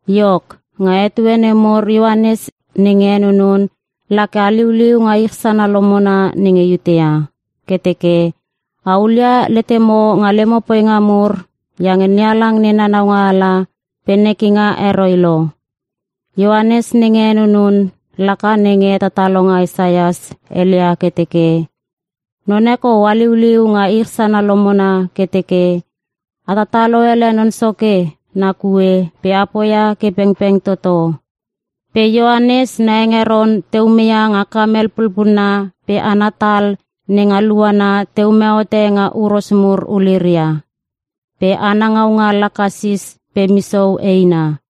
Iok, nga etue nemur Ioanes nenge henunun la ke haliuliu nga ich sana lomona nenge Iutea ke teke, “A hulia letemo nga lemo poinga mur iange NeHalang nena naualanga pe nekinga heroi lo.” Ioanes nenge henunun laka nenge hetatalonga Isaias heleia ke teke, “Non e kou haliuliu nga ich sana lomona ke teke, ‘A tatalo ele Non Soke na kue pe a poia ke pengpeng toto.’” Pe Ioanes na hengeron te ume ia nga kamel pulpulna pe ana tal nenga luana te ume hote nga huros mur uliria. Pe ana ngaunga laka sis pe misou eina.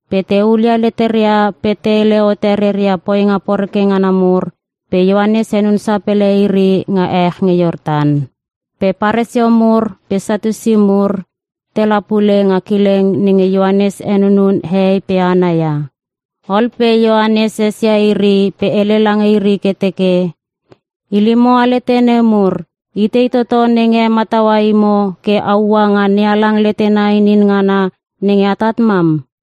Pe te hulia leteria pe te hele hote reia poinga poreke ngana mur pe Ioanes henun sapele iri nga ech nge Iortan. Pe Paresio mur pe Satiusi mur tela pule nga kileng nenge Ioanes henunun hehei pe hana ia. Ol pe Ioanes esia iri pe hele lange iri ke teke, “Ilimo alete nemur itei toto nenge hemataua imo ke a ua nga NeHalang letena inin ngana nenge atat mam?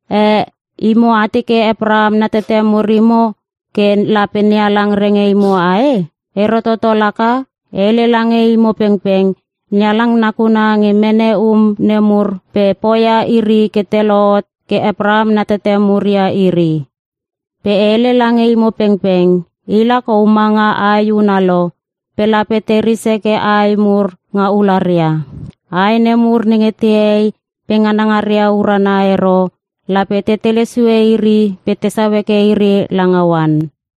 Eh! Imo a teke Apraham na tete mur imo ke lape NeHalang renge imo ae? Ero toto laka! E hele lange imo pengpeng NeHalang nakuna nge mene um nemur pe poia iri ke te lohot ke Apraham na tete mur ia iri! Pe e hele lange imo pengpeng, ila kou ma nga ae huna lo pe lape te ris heke ae mur nga ularia. Ae nemur nenge te hei pe nganangaria urana ero lape te tele sue iri pe tesau heke iri langa oan.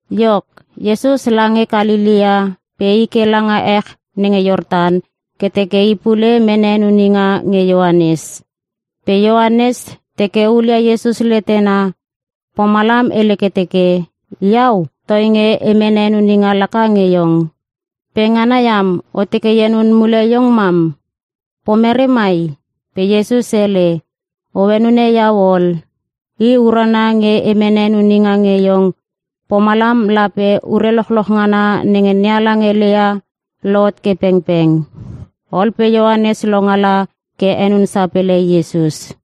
Iok, Iesus lange Kalelea pe i ke langa ech nenge Iortan ke teke I pule mene henuninga nge Ioanes. Pe Ioanes teke hulia Iesus letena pomalam hele ke teke, “Iau toinge e mene henuninga laka nge iong. Pe ngana iam o teke e henun mule iong mam! Pomerei mai?” Pe Iesus hele, “O henune iau ol. I urana nge e mene henuninga nge iong pomalam lape ure lochloch ngana nenge NeHalang heleia lohot ke pengpeng.” Ol pe Ioanes longala ke henun sapele Iesus.